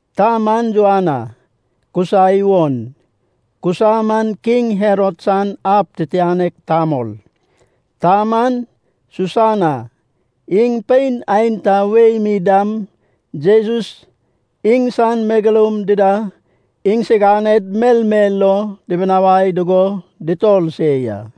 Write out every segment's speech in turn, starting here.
Ta man Joana, Kusa iwon. Kusa man King Herod san ab titianek tamol. Ta man Susana. Iŋ pein aenta wei mi dam Jesus, iŋsan megeloum dida iŋsiganed melmel lo dibinawai dugo dutor se ya.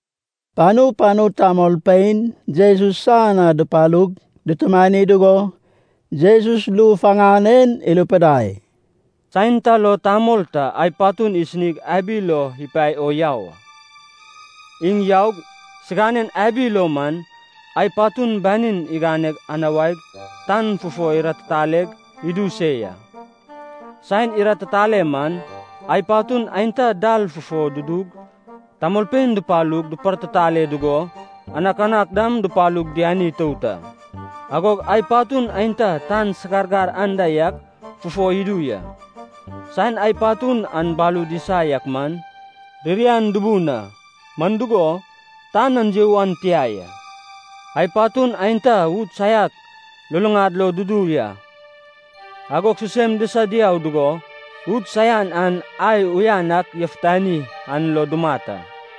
Panu panu tamolpein Jesus san na dupalug, dutumani dugo Jesus ru faŋan en irupidai, “Saen ta lo tamol ta ai patun isinig abi lo ipae o yau a. Iŋ yaug siŋanen abi lo man ai patun banin igane anuag tan fufo iratitaleg idu se ya. Saen iratitale man, ai patun aenta dal fufo dudug tamolpein dupalug dupartitale dugo, anakanak dam dupalug diani itout a. Agog ai patun aenta tan sagargar anda yak fufo idu ya. Saen ai patun an balud isa yak man, ririan dubun a, man dugo, tan an you an tia ya. Ai patun aenta ud saiak luluŋad lo dudu ya, agog sisem disa diau dugo ud saian an ai uyan ak yafutanai an lo dumat a.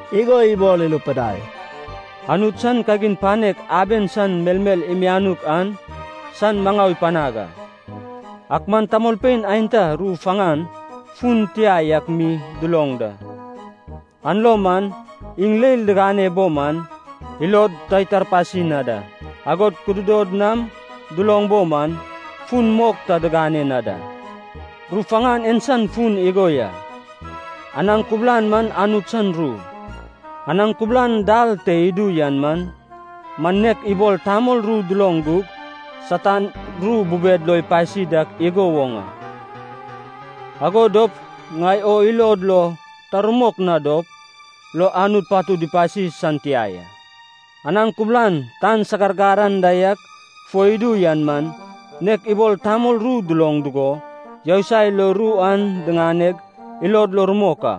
igo ibol irupidai, “Anut iŋsan kagin panek aben san melmel imianuk an san maŋau ipanaŋ a. Ak man tamolpein aenta ru faŋan fun tia yak mi duloŋ da. An lo man, ‘Iŋ leil digane bo man, ilod ta itarpasi na da. Agod kududod nam duloŋ bo man, fun mok ta diŋane na da.’” “Ru faŋan en san fun igo ya: anaŋ kubulan man Anut san ru. Anaŋ kubulan dal te idu yan man nek ibol tamol ru duloŋ gug Satan ru bubed lo ipasi dak igo woŋ a. Ago dop ŋai o ilod lo ta rumok na dop lo Anut patud ipasi san tia ya. Anaŋ kubulan tan sagargar anda yak fo idu yan man nek ibol tamol ru duloŋ dugo yousai lo ru an diŋaneg ilod lo rumok a.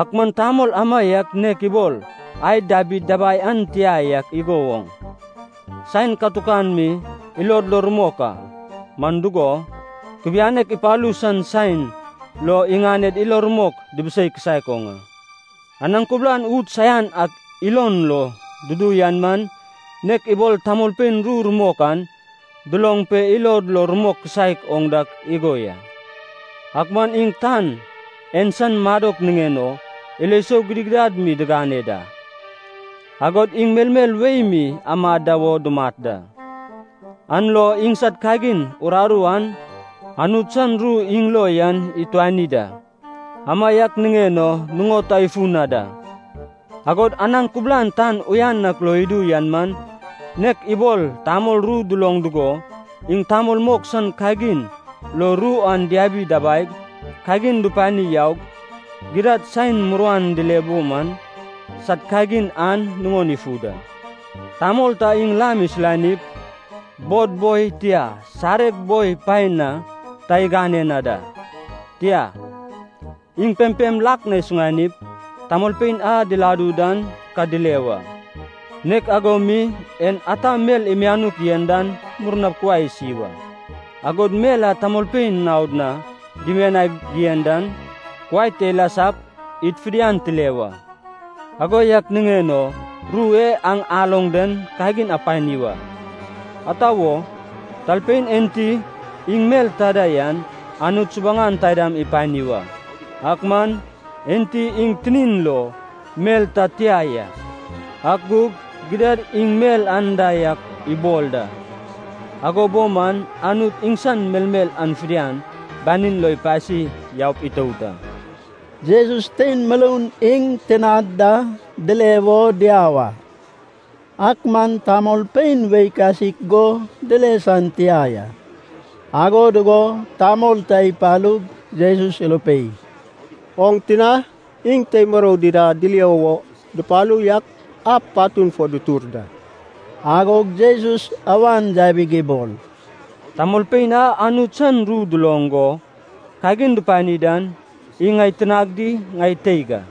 Ak man tamol amaiak nek ibol ai dabid dabai an tia yak igo woŋ, saen katukan mi ilod lo rumok a. Man dugo, kubianek ipalu san saen lo iŋaned ilo rumok dibisei kisaek oŋ a. Anaŋ kubulan ud saian ak ilon lo dudu yan man nek ibol tamolpein ru rumok an duloŋ pe ilod lo rumok kisaek oŋ dak igo ya. Ak man iŋ tan en san madok niŋen o ilo sou gidigidad mi digane da, agod iŋ melmel wei mi amad da wo dumat da, an lo iŋsad kagin uraru an Anut san ru iŋ lo yan ituani da. Amaiak niŋen o nuŋod ta ifu na da. Agod anaŋ kubulan tan uyan ak lo idu yan man nek ibol tamol ru duloŋ dugo, iŋ tamol mok san kagin lo ru an diabi dabaig, kagin dupani yaug, gidad saen muruan dile bo man sad kagin an nuŋon ifu da.” “Tamol ta iŋ lam isulanip, bod boi, tia, sareg boi paen na ta igane na da. Tia, iŋ pempem lak na isuŋanip, tamolpein a diladu dan ka dile wa. Nek ago mi en ata mel imianuk yen dan murnap kuai isi wa. Agod mel a tamolpein naod na dimianig yen dan, kuai te ilasap id fidian tile wa. Ago yak niŋen o ru e aŋ aloŋ den kagin apani wa. Ata wo? Talpein enti iŋ mel ta da yan, Anut subuŋan taidam ipani wa. Ak man, enti iŋ tinin lo mel ta tia ya, ak gug gidad iŋ mel anda yak ibol da, ago bo man Anut iŋsan melmel an fidian banin lo ipasi yaup itout a.” Jesus tein muroun iŋ tinad da dile wo diau a. Ak man tamolpein wei kasik go dile san tia ya. Ago dugo tamol ta ipalug Jesus irupei, “Oŋ tina iŋ tei murou dida dilio wo dupalu yak ab patun fo dutur da.” Agog Jesus awan yabig ibol, “Tamolpein a Anut san ru duloŋ go kagin dupani dan, iŋ ŋai tinag di ŋai teig a.”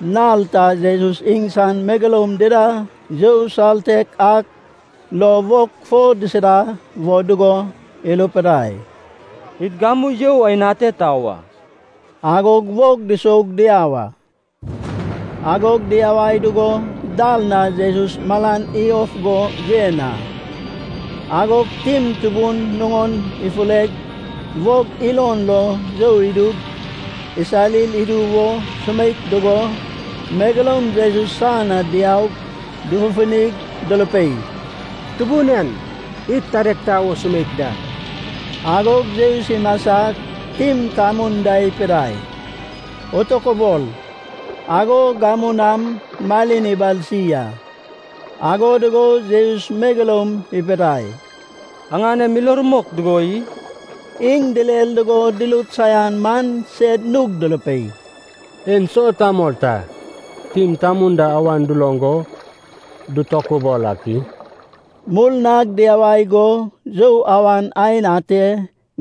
Nal ta Jesus iŋsan megeloum dida you saltek ak lo wog fo disida wo dugo irupidai, “Id gamu you aen ate tau a.” Agog wog dusoug diau a. Agog diyawai dugo dal na Jesus malan iyof go yen a. Agog tim tubun nuŋon ifureg, wog ilon lo you idug, isarir idu wo sumeik dugo, megeloum Jesus san na diaug dufufunig durupei, “Tubun en, id tadeg tau o sumeik da.” Agog Jesus imasag, tim tamun da ipidai, “Atokabol.” Agog gamu nam malin ibalsi a. Ago dugo Jesus megeloum ipidai, “Aŋanem ilo rumok dugo i?” Iŋ direr dugo durut saian man sed nug durupei, “Enso tamol ta, tim tamun da awan duloŋ go dutokubol ak i?” Murnag diyawai go you awan aen ate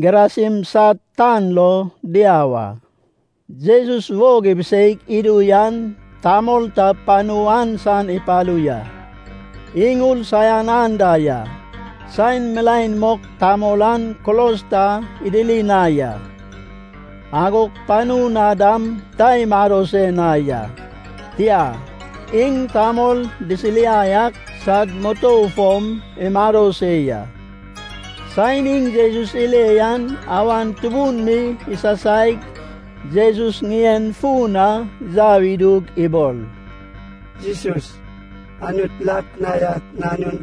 Gerasin sad tan lo diau a. Jesus wog ibiseig idu yan, tamol ta panu an san ipalu ya, iŋ ur saian anda ya. Saen milaen mok tamol an kulos ta idiri na ya. Agog panu na dam ta imado se na ya. Tia, iŋ tamol disiriai ak sad mutou fom imado se ya. Saen iŋ Jesus ile yan awan tubun mi isasaig Jesus ŋien fun na yau idug ibol, “Jesus, Anut lak na yak nanun,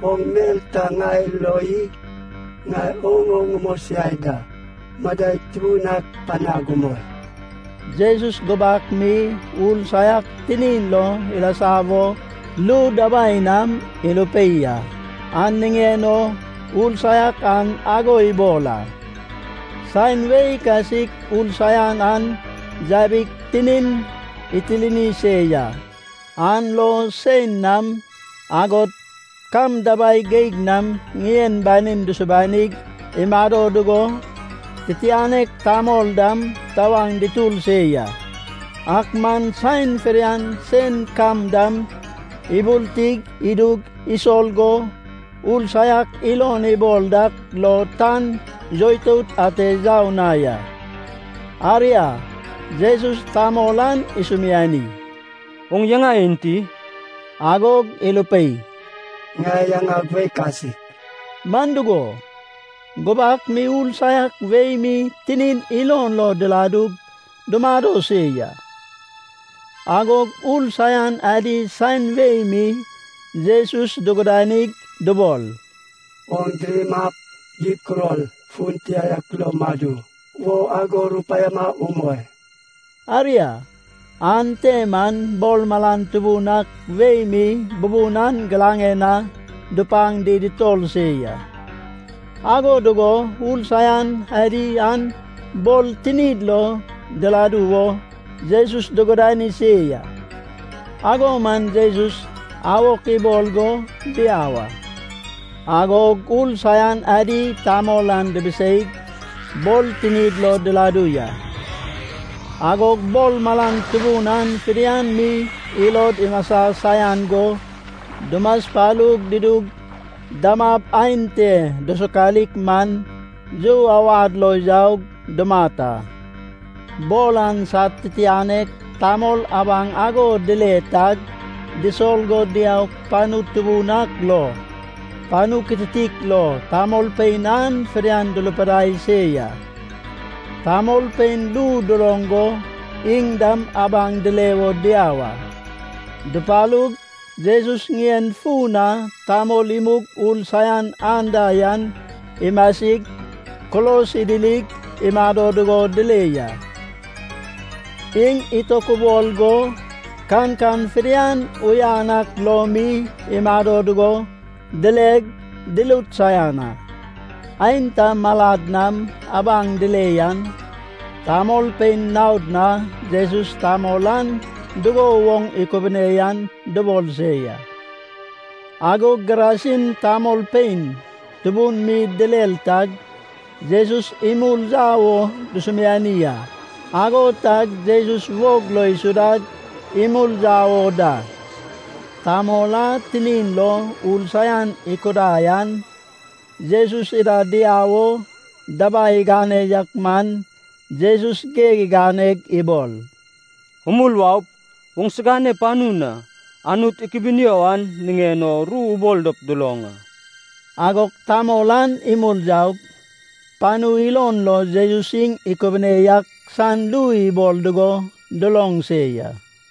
oŋ mel ta ŋai lo i? Ŋai oŋ o ŋamosiai da, madai tubun ak panag umoi!” Jesus gubak mi ur saiak tinin lo ilasa wo ru dabai nam irupei a, an niŋen o ur saiak an ago ibol a. (Saen wei kasik ur saian an yabig tinin itirni se ya. An lo sein nam, agod kam dabai geig nam ŋien banin dusubanig imado dugo, titianek tamol dam tawaŋ dutur se ya. Ak man saen fidian sein kam dam iburti idug isol go ur saiak ilon ibol dak lo tan yoitout ate yau na ya.) Aria, Jesus tamol an isumiani, “Oŋ yaŋa enti?” Agog irupei, “Ŋai yaŋag Wei Kasik” Man dugo, gubak mi ur saiak wei mi tinin ilon lo diladug dumado se ya. Agog ur saian adi saen wei mi Jesus dugudanig dubol, “Oŋ diramap gib kuror fun tia ak lo madu wo ago rupaiama umoi.” Aria, ante man bor malan tubun ak wei mi bubun an giraŋen na dupaŋ di dutor se ya. Ago dugo ur saian adi an bor tinid lo diladu wo Jesus dugudani se ya. Ago man Jesus awok ibol go diau a. Agog ur saian adi tamol an dibiseig, bor tinid lo diladu ya. Agog bor malan tubun an fidian mi ilod imasa saian go dumaspalu dudug, damab aen te dusokalik man, you awad lo yaug dumat a. Bor an sad titianek tamol abaŋ ago dile tag disol go diaug panu tubun ak lo, panu kitiktik lo tamolpein an fidian durupidai se ya. Tamolpein ru duloŋ go, iŋ dam abaŋ dile wo diau a. Dupalug, Jesus ŋien fun na tamol imug ur saian anda yan imasig, kulos idirig imado dugo dile ya. Iŋ itokubol go, kankan fidian uyan ak lo mi imado dugo dileg, durut saian a. Aenta malad nam abaŋ dile yan, tamolpein naod na Jesus tamol an dugo woŋ ikubune yan dubol se ya. Agog Gerasin tamolpein tubun mi direr tag Jesus imul yau wo dusumiani a. Ago tag Jesus wog lo isudag imul yau o da. Tamol a tinin lo ur saian ikudai an, Jesus ida diau o dabai igane yak man Jesus geg iganeg ibol, “Umul waup, oŋsigane panu na, Anut ikubunio an niŋen o ru ubol dop duloŋ a.” Agog tamol an imul yaug, panu ilon lo Jesus iŋ ikubune yak san ru ibol dugo duloŋ se ya.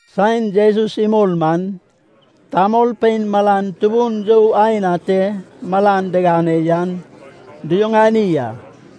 Saen Jesus imul man, tamolpein malan tubun you aen ate malan digane yan duyuŋani a.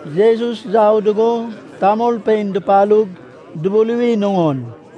Jesus yau dugo tamolpein dupalug dubuluwi nuŋon.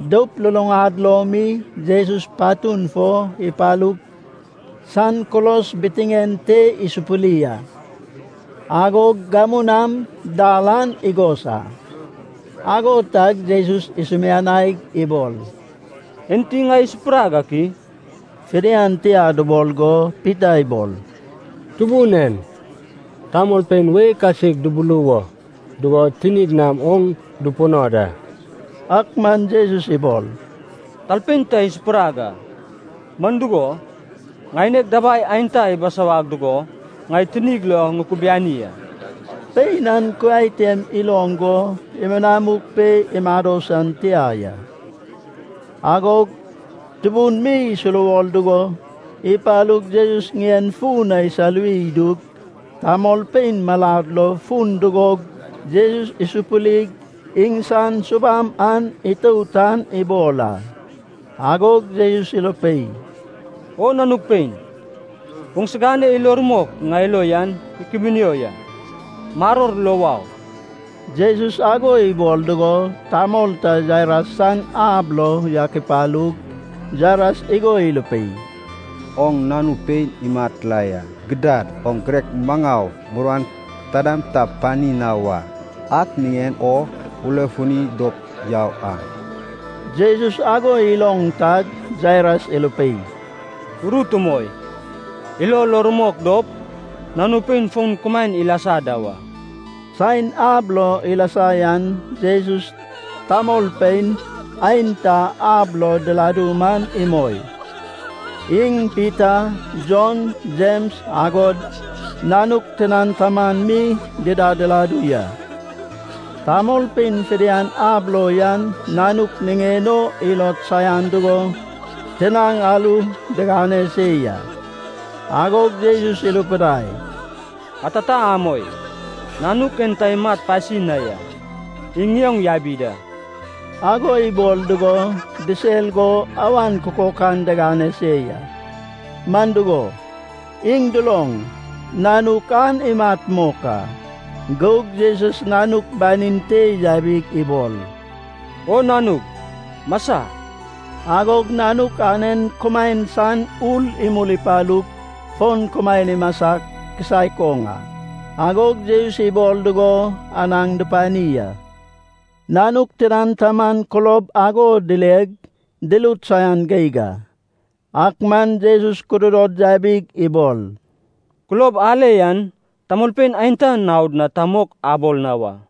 Doup luluŋad lo mi Jesus patun fo ipalug san kulos bitiŋen te isupuri a. Agog gamu nam dar an igos a. Ago tag Jesus isumianaig ibol, “Enti ŋai isupurag ak i?” Fidian tia dubol go Pita ibol, “Tubun en, tamolpein wei kasik dubuluwo dugo tinid nam oŋ dupuno da!” Ak man Jesus ibol, “Talpein ta isupurag a, man dugo, ŋaineg dabai aenta ibisawag dugo ŋai tinig lo ŋukubiani a.” Pein an kuai tem iloŋ go, imunamuk pe imado san tia ya. Agog tubun mi isuruwor dugo, ipalug Jesus ŋien fun na isaluwi idug, tamolpein malad lo fun dugog Jesus isupurig, iŋsan subam an itout an ibol a. Agog Jesus irupei, “O nanug pein, oŋsigane ilo rumok ŋai lo yan ikubunio ya. Maror lo wau.” Jesus ago ibol dugo, tamol ta Jairas san ab lo yak ipalug, Jairas igo irupei, “Oŋ nanu pein imat la ya. Gidad oŋ girek maŋau muruan taidam ta pani na wa. Ak niŋen o ulefuni dop yau a.” Jesus ago iloŋ tag Jairas irupei, “Urut umoi. Ilo lo rumok dop, nanu pein fon kumaen ilasa da wa.” Saen ab lo ilasa yan Jesus tamolpein aenta ab lo diladu man imoi. Iŋ Pita, Jon, Jems agod nanuk tinan taman mi dida diladu ya. Tamolpein fidian ab lo yan nanuk niŋen o ilod saian dugo tinaŋ aru digane se ya. Agog Jesus irupidai, “Atata amoi. Nanuk en ta imat pasi na ya. Iŋ ŋioŋ yabi da.” Ago ibol dugo disel go awan kukokan digane se ya. Man dugo, iŋ duloŋ, nanuk an imat mok a. Gug Jesus nanuk banin te yabig ibol, “O nanug, masa!” Agog nanuk anen kumaen san ur imul ipalug fon kumaen imasa kisaek oŋ a. Agog Jesus ibol dugo anaŋ dupani a. Nanuk tinan taman kulob ago dileg, durut saian geig a. Ak man Jesus kudod yabig ibol, “Kulob ale yan tamolpein aenta naod na ta mok abol na wa.”